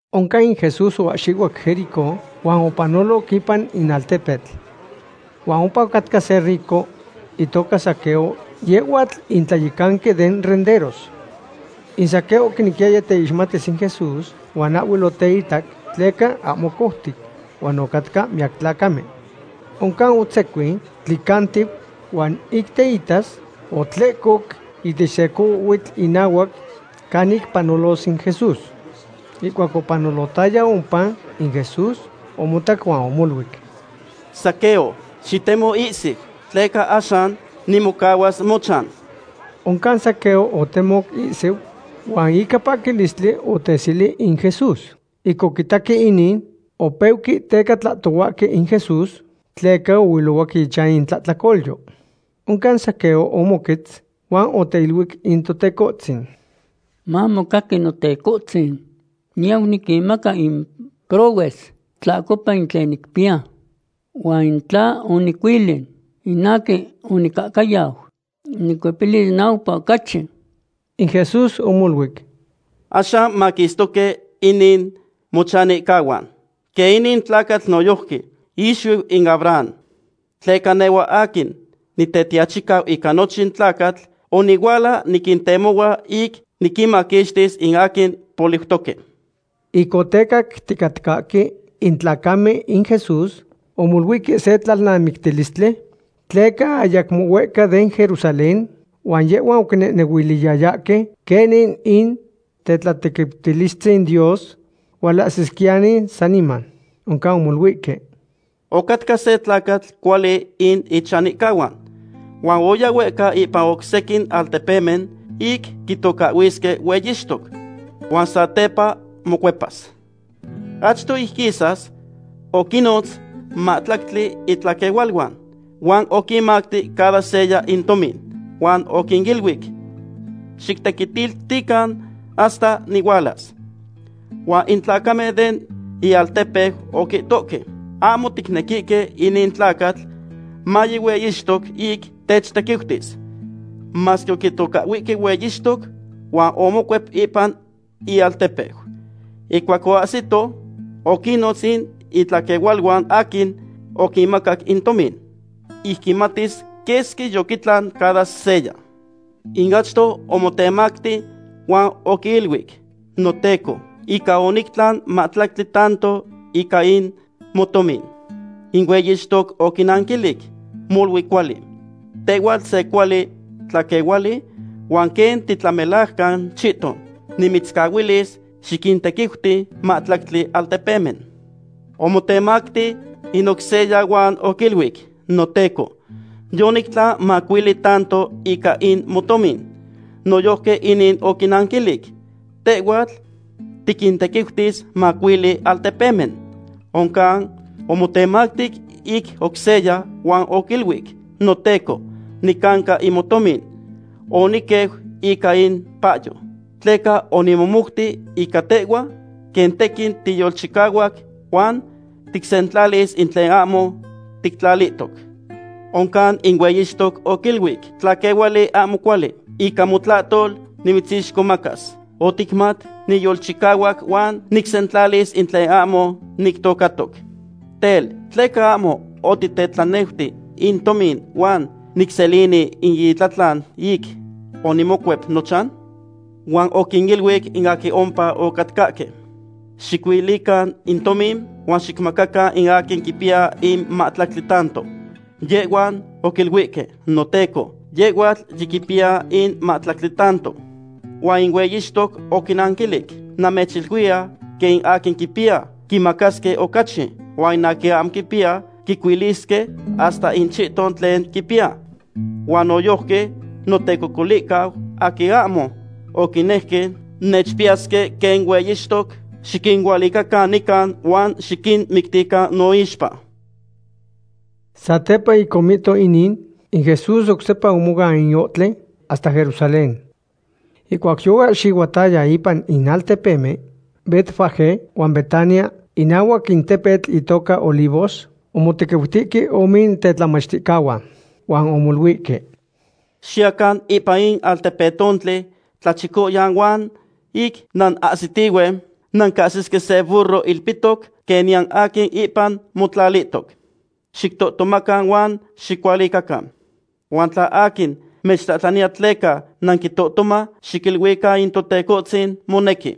Oncan in Jesús oahxihuac Jericó huan opanoloc ipan in altepetl. Huan ompa ocatca se rico itoca Zaqueo, yehhuatl in tlayecanqui den renderos. In Zaqueo oquinequiyaya teixmatis in Jesús, huan ahhuel oteitac tleca ahmo coutic huan ocatcahque miyac tlacamen. Oncan otzecuin tlicantiu, huan ic teitas otlehcoc ihtech se cohuitl inahuac canic panolos in Jesús. Ihcuac opanolohtaya ompa in Jesús, omotac huan omoluic: ―Zaqueo, xitemo ihsiu, tleca axan nimocahuas mochan. Oncan Zaqueo otemoc ihsiu huan ica paquilistli oteseli in Jesús. Ic oquitaque inin, opeuque teca tlahtohuahque in Jesús, tleca ohuilohuac ichan in tlahtlacolyo. Oncan Zaqueo omoquetz huan oteiluic in Totecohtzin: ―Mamocaqui, Notecohtzin. Niyau niquinmaca in prohues tlahcopa in tlen nicpiya. Huan in tla onicuili in aquin onicahcayau, nicuepilis naupa ocachi. In Jesús omoluic: ―Axan maquistoque inin mochanihcahuan, quen inin tlacatl noyojqui ixuiu in Abraham. Tleca nehhua aquin Nitetiachicau ica nochin tlacatl onihuala niquintemohua ic niquinmaquixtis in aquin poliutoque. Ic otecacticatcahque in tlacamen in Jesús, omoluihque se tlalnamictilistli, tleca ayacmo huehca den Jerusalén, huan yehhuan oquinehnehuiliyayahque quenin in tetlatequiutilistzin Dios hualahsisquiyani saniman. Oncan omoluihque: ―Ocatca se tlacatl cuali in ichanihcahuan, huan oya huehca ipan oc sequin altepemen ic quitocahhuisque hueyixtoc. Huan satepa mocuepas. Achto ic quisas, oquinnotz mahtlactli itlaquehualuan, huan oquinmacti cada seya in tomin, huan oquiniluic: “Xictequitiltican hasta nihualas.” Huan in tlacamen den ialtepeu oquihtohque: “Ahmo ticnequihque inin tlacatl maye hueyixtos ic techtequiutis.” Masque oquitocahhuihque hueyixtoc huan omocuep ipan ialtepeu. Ihcuac oahsito, oquinnotz in itlaquehualuan aquin oquinmacac in tomin, ic quimatis quesqui yoquitlan cada seya. In achto omotemacti huan oquiiluic: “Noteco, ica onictlan mahtlactli tanto ica in motomin.” In hueyixtoc oquinanquilic: “Molui cuali; tehhuatl se cuali tlaquehuali huan quen titlamelajcan chihton, nimitzcahuilis xiquintequiuti mahtlactli altepemen.” Omotemacti in oc seya huan oquiluic: “Noteco, yonictlan macuili tanto ica in motomin.” Noyojqui inin oquinanquilic: “Tehhuatl tiquintequiutis macuili altepemen.” Oncan omotemacti in oc seya huan oquiluic: “Noteco, nicanca in motomin. Oniqueu ica in payo. Tleca onimomouti ica tehhua, quen tequin tiyolchicahuac huan ticsentlalis in tlen ahmo tictlalihtoc.” Oncan in hueyixtoc oquiluic: “Tlaquehuali ahmo cuali, ica motlahtol nimitzixcomacas. Oticmat niyolchicahuac huan nicsentlalis in tlen ahmo nictocatoc. Tel, ¿tleca ahmo otitetlaneuti in tomin huan nicselini in itlatlan ic onimocuep nochan?” Huan oquiniluic in aquin ompa ocatcahque: “Xicuilican in tomin huan xicmacacan in aquin quipiya in mahtlactli tanto.” Yehhuan oquiluihque: “Noteco, yehhuatl yiquipiya in mahtlactli tanto.” Huan in hueyixtoc oquinnanquilic: “Namechiluiya quen in aquin quipiya, quimacasque ocachi, huan in aquin ahmo quipiya, quicuilisque hasta in chihton tlen quipiya. Huan noyojqui notecocolihcahuan aquin ahmo oquinejque nechpiyasque quen hueyixtoc, xiquinualicacan nican huan xiquinmictican noixpa.” Satepa ic omihto inin, in Jesús oc sepa omoan in ohtli hasta Jerusalén. Ihcuac yoahxihuataya ipan in altepemen Betfagé huan Betania, inahuac in tepetl itoca Olivos, omotequiutihque ome tetlamachticahuan. Huan omoluihque: ―Xiyacan ipan in altepetontli tlachicoyan huan ic nanahsitihue, nancahsisque se burro ilpihtoc, quen niyan aquin ipan motlalihtoc. Xictohtomacan huan xicualicacan. Huan tla aquin mechtlahtlaniya tleca nanquitohtoma, xiquiluican in Totecohtzin monequi.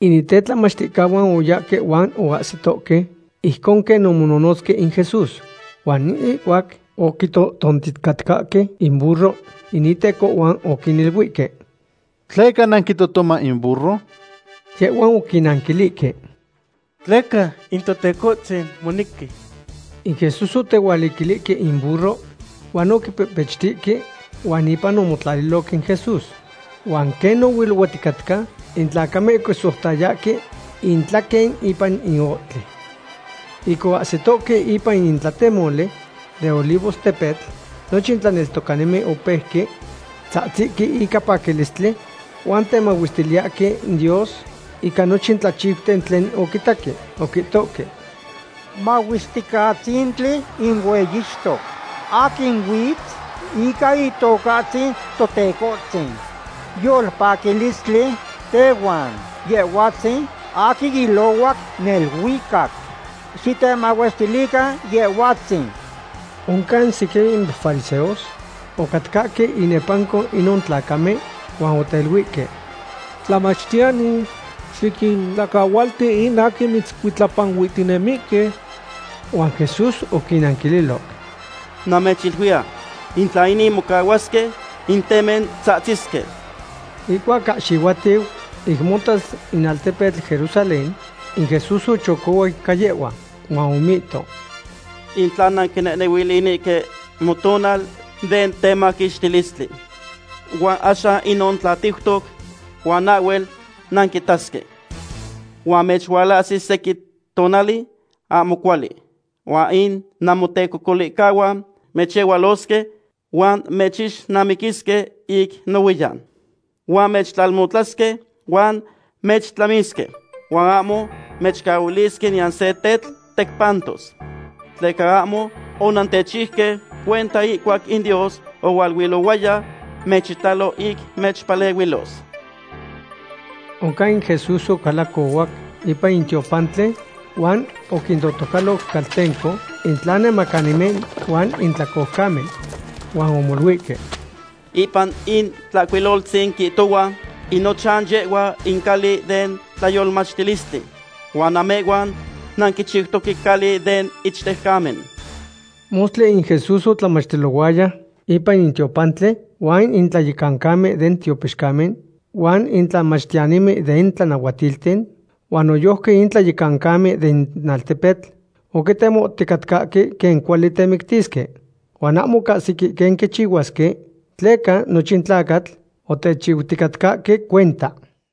In tetlamachticahuan oyahque huan ocahsitohque ijcon quen omononotzque in Jesús. Huan ihcuac oquitohtonticatcahque in burro, in itecohuan oquiniluihque: ―¿Tleca nanquitohtoma in burro? Yehhuan oquinnanquilihque: ―Tleca in Totecohtzin monequi. In Jesús otehualiquilihque in burro, huan oquipehpechtihque huan ipan omotlaliloc in Jesús. Huan quen ohuilohuaticatca, in tlacamen oquisoutayahque intlaquen ipan in ohtli. Ic oahsitohque ipan in tlatemoli den Olivos tepetl, nochin tlaneltocanimen opeuque tzahtzihque ica paquilistli huan temahuestiliyahque in Dios ica nochin tlachiuten tlen oquitaque. Oquihtohque: ―¡Mahuesticatzintli in hueyixtoc aquin huitz ica Itocahtzin Totecohtzin! Yolpaquilistli tehuan Yehhuatzin aquin ilohuac neluicac. ¡Xitemahuestilican Yehhuatzin! Oncan sequin fariseos ocatcahque inepanco inon tlacamen huan oteiluihque: ―Tlamachtiyani, xiquintlacahualti in aquin mitzcuitlapanuihtinemihque. Huan Jesús oquinnanquililoc: ―Namechiluiya, in tla inin mocahuasque, in temen tzahtzisque. Ihcuac ahxihuatiu, ic motas in altepetl Jerusalén, in Jesús ochocohuac ica yehhua. Huan omihto: ―In tla nanquinehnehuilinihque motonal den temaquixtilistli. Huan axan inon tlatiutoc huan ahhuel nanquitasque. Huan mechualahsis sequin tonali ahmo cuali, huan in namotecocolihcahuan mechyehualosque huan mechixnamiquisque ic nohuiyan. Huan mechtlalmotlasque huan mechtlamisque, huan ahmo mechcahuilisque niyan se tetl tecpantos. Tleca ahmo onantechiuque cuenta ihcuac in Dios ohualuilohuaya mechitalo ic mechpalehuilos. Oncan in Jesús ocalacohuac ipan in tiopantli huan oquintotocaloc caltenco in tlanemacanimen huan in tlacoucamen. Huan omoluihque: ―Ipan in Tlahcuiloltzin quihtohua: “In nochan yehhua in cali den tlayolmachtilistli”; huan namehhuan nanquichiutoque cali den ichtejcamen. Mostli in Jesús otlamachtilohuaya ipan in tiopantli, huan in tlayecancamen den tiopixcamen, huan in tlamachtiyanimen den tlanahuatilten, huan noyojqui in tlayecancamen den altepetl oquitemoticatcahque quen cuali temictisque. Huan ahmo ocahsique quen quichihuasque tleca nochin tlacatl otechiuticatcahque cuenta.